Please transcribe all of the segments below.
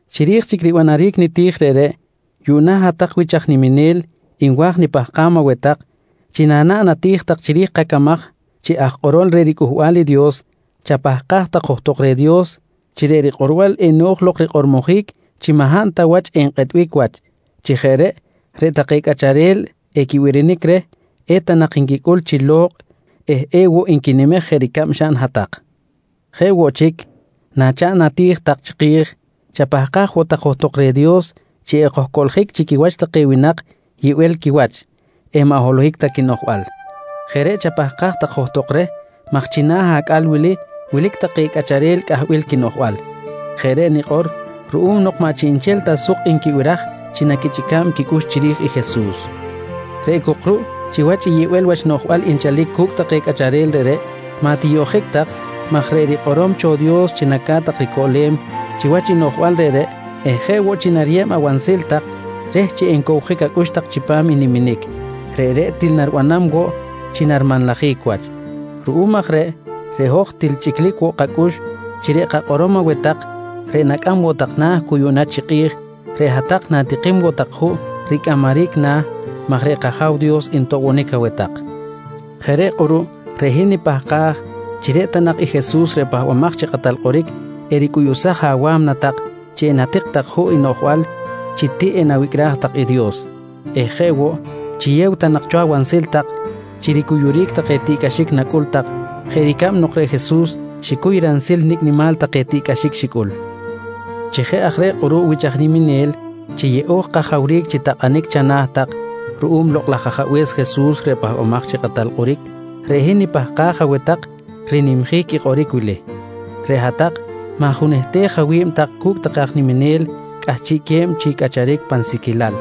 Chiri̱j chic ribanaric niti̱j reꞌreꞌ, yuꞌna hat-tak wich aj niminel nwa̱j nipahkam aweh tak chi nanaꞌn ati̱j tak chiri̱j kacamaj chi aj kꞌorol reh rikꞌorbal i Dios, chapahkaj tak johtok reh Dios chi reꞌ rikꞌorbal eno̱j lok rikꞌormojic chi maꞌ hab ta wach enkꞌetbic wach. Chi jeꞌ reꞌ, reꞌ take cꞌacharel equibirinic reh eta nak nquicꞌul chi lo̱kꞌ eh ewoꞌ nquinimej jeꞌ ricab xaꞌn hat-tak. Jeꞌ woꞌ chic nachaꞌn ati̱j tak chiki̱j, chapahkaj woꞌ tak johtok reh Dios chi ekojcoꞌljic chi quiwach take winak yibel quiwach eh maꞌ holohic ta quinoꞌjbal. Jeꞌ reꞌ chapahkaj tak johtok reh maj china̱ acꞌal wili wilic take cꞌacharel cꞌahbil quinoꞌjbal. Jeꞌ reꞌ nikꞌor ruꞌum nok maꞌ chiꞌnchel ta suk nquibiraj chi naquichꞌica̱b quicꞌux chiri̱j i Jesus. Reꞌ cok ruꞌ, chiwach i yibel wach noꞌjbal nchalic cu̱cꞌ take cꞌacharel reꞌreꞌ, maꞌ tiyoꞌjic tak maj reꞌ rikꞌorom cho Dios chi naca̱t tak ricoꞌlem chiwach i noꞌjbal reꞌreꞌ eh jeꞌ woꞌ chi nariyeb awansil tak reh chi encowjic acꞌux tak chipam i niminic, reꞌreꞌ til naribanam woꞌ chi narimanlajic wach. Ruꞌum aj reꞌ, reꞌ hoj til chꞌiclic woꞌ kacꞌux chi reꞌ kakꞌorom aweh tak, reꞌ na̱cꞌamam woꞌ tak na̱ cu yuꞌna chi kꞌi̱j reꞌ hat-tak na̱tikim woꞌ tak juꞌ ricꞌamaric na̱ maj reꞌ kAja̱w Dios ntoꞌbonic aweh tak. Jeꞌ reꞌ kꞌuruꞌ reꞌ hin nipahkaj chi reꞌ ta nak i Jesus reꞌ Pahbamaj chi Kꞌatal Kꞌoric, ericꞌuyuꞌsaj awa̱mna tak chi enatik tak juꞌ i noꞌjbal chi tiꞌ enawicꞌraj tak i Dios eh jeꞌ woꞌ, chiyew ta nak cho awansil tak chi ricuyuric take tiꞌcꞌaxic nacꞌul tak jeꞌ ricab nok reꞌ Jesus xicuy ransil nicꞌ nimal take tiꞌcꞌaxic xicꞌul. Chi jeꞌ aj reꞌ kꞌuruꞌ wich aj niminel, chi yeꞌo̱j kajawric chi takꞌanic chana̱ tak ruꞌum Lokꞌ laj Ajabe̱s Jesus reꞌ Pahbamaj chi Kꞌatal Kꞌoric, reꞌ hin nipahkaj aweh tak rinimjic i kꞌoric wili: Reꞌ hat-tak ma̱junehtej awi̱b tak cu̱cꞌ take aj niminel cꞌahchiꞌ que̱b chi cꞌacharic pan siquilal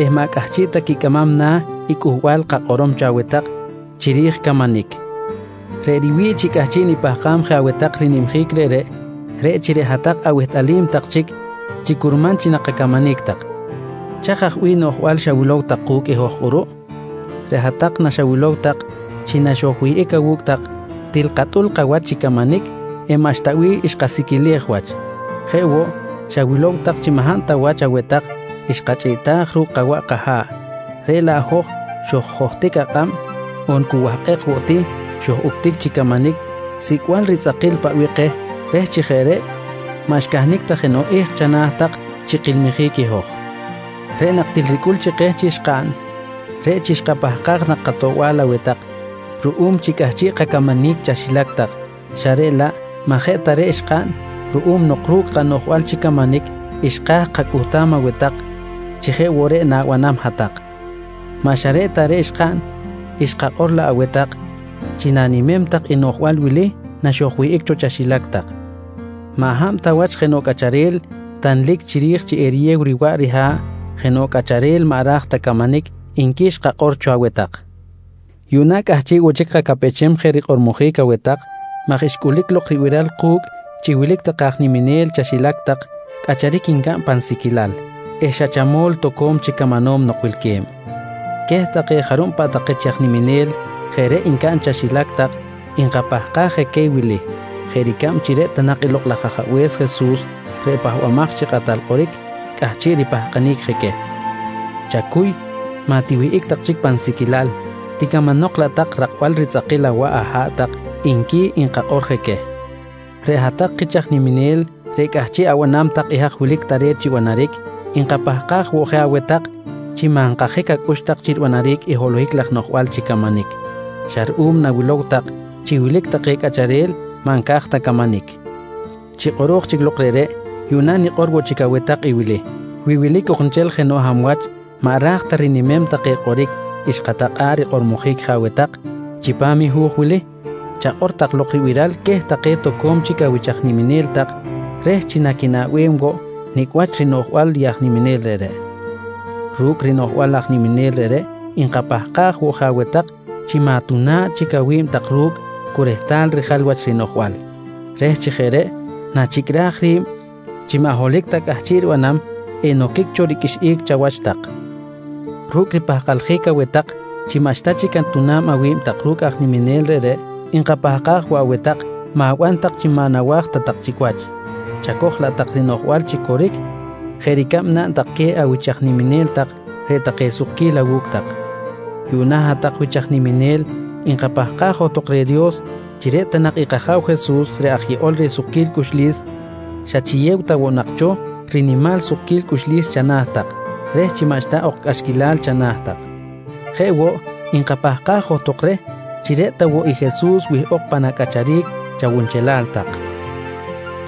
eh maꞌ cꞌahchiꞌ ta quicꞌamam na̱ i cꞌuhbal kakꞌorom cho aweh tak chiri̱j camanic. Reꞌ riwi̱ꞌ chi cꞌahchiꞌ nipahkam je aweh tak rinimjic reꞌreꞌ, reꞌ chi reꞌ hat-tak awehtꞌalim tak chic chi curman chi nakacamanic tak. Chaj aj bih noꞌjbal xawilow tak ku̱cꞌ hoj kꞌuruꞌ? Reꞌ hat-tak xawilow tak chi naxojwihꞌic awu̱cꞌ tak, til katꞌul kawach chi camanic eh maꞌxta bih xkasiquilej wach. Jeꞌ woꞌ, xawilow tak chi maꞌ hab ta wach aweh tak xkachꞌiꞌtaj ru̱cꞌ kawaꞌ kaha̱ꞌ reꞌ laꞌ hoj xoj-johtic akꞌab on cu wahkꞌek woꞌ ti xoj-uctic chi camanic sicꞌbal ritzꞌakil paꞌ bih keh reh chi jeꞌ reꞌ maꞌ xcahnic ta jenoꞌ ihk chana̱ tak chi kilmijic i hoj. Reꞌ nak til ricꞌul chi keh chi xkaꞌn, reꞌ chi xkapahkaj nak katoꞌbal aweh tak ruꞌum chi cꞌahchiꞌ kacamanic chaxilac tak xa reꞌ laꞌ maꞌ jeꞌ ta reꞌ xkaꞌn ruꞌum nok ru̱cꞌ kanoꞌjbal chi camanic xka̱j kacꞌuhtam aweh tak chi jeꞌ woꞌ reꞌ na̱banam hat-tak. Maꞌ xa reꞌ ta reꞌ xkaꞌn, xkakꞌor laꞌ aweh tak chi na̱nimem tak i noꞌjbal wili naxojwihꞌic woꞌ cho chaxilac tak: «Maꞌ hab ta wach jenoꞌ cꞌacharel tanlic chiri̱j chi eriyew riwaꞌ riha̱ꞌ jenoꞌ cꞌacharel maꞌ raj ta camanic, nqui xkakꞌor cho aweh tak. Yuꞌna cꞌahchiꞌ woꞌ chic kacaꞌpechem je rikꞌormojic aweh tak maj xcꞌulic lok ribiral ku̱cꞌ chi wilic take aj niminel chaxilac tak cꞌacharic ncaꞌn pan siquilal eh xa chamo̱l toco̱m chic camanom nok wilque̱b. Queh take jarub paꞌ take chi aj niminel jeꞌ reꞌ ncaꞌn chaxilac tak, nkapahkaj je queh wili jeꞌ ricab chi reꞌ ta nak i Lokꞌ laj Ajabe̱s Jesus reꞌ Pahbamaj chi Kꞌatal Kꞌoric cꞌahchiꞌ ripahkanic je queh: «Chacuy, maꞌ tiwihꞌic tak chic pan siquilal ticamanok laꞌ tak rakbal ritzꞌakil awaꞌ aha̱ꞌ tak, nqui nkakꞌor je queh. Reꞌ hat-tak kich aj niminel reꞌ cꞌahchiꞌ abanam tak i haj wilic tare̱t chi banaric, nkapahkaj woꞌ je aweh tak chi maꞌ nkajic acꞌux tak chi ribanaric i holohic laj noꞌjbal chi camanic xa ruꞌum nawilow tak chi wilic take cꞌacharel maꞌ nca̱j ta camanic. Chi kꞌoro̱j chic lok reꞌreꞌ, yuꞌna nikꞌor woꞌ chic aweh tak i wili: Wi wilic ok nchel jenoꞌ hab wach maꞌ ra̱j ta rinimem take kꞌoric xkatakꞌa̱ꞌ rikꞌormojic je aweh tak chipam i hu̱j wili, chakꞌor tak lok ribiral queh take toco̱m chic awich aj niminel tak reh chi naquinaꞌbem woꞌ nicꞌ wach rinoꞌjbal aj niminel reꞌreꞌ. Ru̱cꞌ rinoꞌjbal aj niminel reꞌreꞌ, nkapahkaj woꞌ jeꞌ aweh tak chi ma̱tuna̱ꞌ chic awi̱b tak ru̱cꞌ cu rehtal rijal wach rinoꞌjbal, reh chi jeꞌ reꞌ nachicꞌraj ri̱b chi maꞌ holohic ta cꞌahchiꞌ ribanam, enoquic cho riqꞌuixꞌic chawach tak. Ru̱cꞌ ripahkaljic aweh tak chi maꞌxta chic atuna̱b awi̱b tak ru̱cꞌ aj niminel reꞌreꞌ, nkapahkaj woꞌ aweh tak ma̱ban tak chi maꞌ nawa̱j ta tak chic wach, chacoj laꞌ tak rinoꞌjbal chi coric jeꞌ ricab naꞌn tak queh awich aj niminel tak reꞌ take sukquil awu̱cꞌ tak. Yuꞌna hat-tak wich aj niminel nkapahkaj johtok reh Dios chi reꞌ ta nak i kAja̱w Jesus reꞌ aj yeꞌol reh sukquil cꞌuxlis xa chi chiyew ta woꞌ nak cho rinimal sukquil cꞌuxlis chana̱ tak reh chi maꞌxta ok cꞌaxquilal chana̱ tak. Jeꞌ woꞌ, nkapahkaj johtok reh chi reꞌ ta woꞌ i Jesus wihꞌok pan acꞌacharic chawunchelal tak.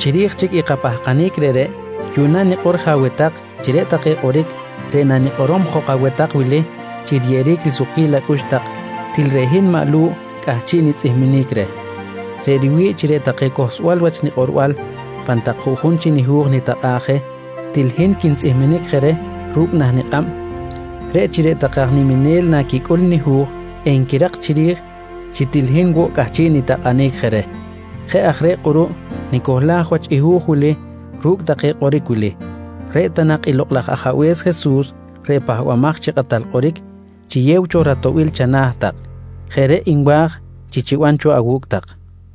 Chiri̱j chic i kapahkanic reꞌreꞌ, yuꞌna nikꞌor je aweh tak chi reꞌ take kꞌoric reꞌ nikꞌorom jok aweh tak wili chi riyeꞌeric risukquil acꞌux tak, til reꞌ hin maꞌ Lu̱ꞌ cꞌahchiꞌ nitzꞌihminic reh. Reꞌ riwi̱ꞌ chi reꞌ take cohlsbal wach nikꞌorbal pan tak juꞌjun chi nihu̱j nitakꞌa̱ꞌ je, til hin quintzꞌihminic je reh ru̱cꞌ nah nikꞌab, reꞌ chi reꞌ take aj niminel naquicꞌul nihu̱j enquirak chiri̱j chi til hin woꞌ cꞌahchiꞌ nitakꞌanic je reh. Jeꞌ aj reꞌ kꞌuruꞌ, nicohlaj wach i hu̱j wili ru̱cꞌ take kꞌoric wili: Reꞌ ta nak i Lokꞌ laj Ajabe̱s Jesus reꞌ Pahbamaj chi Kꞌatal Kꞌoric chiyew cho ratoꞌbil chana̱ tak. Jeꞌ reꞌ nwa̱j chi chiban cho awu̱cꞌ tak.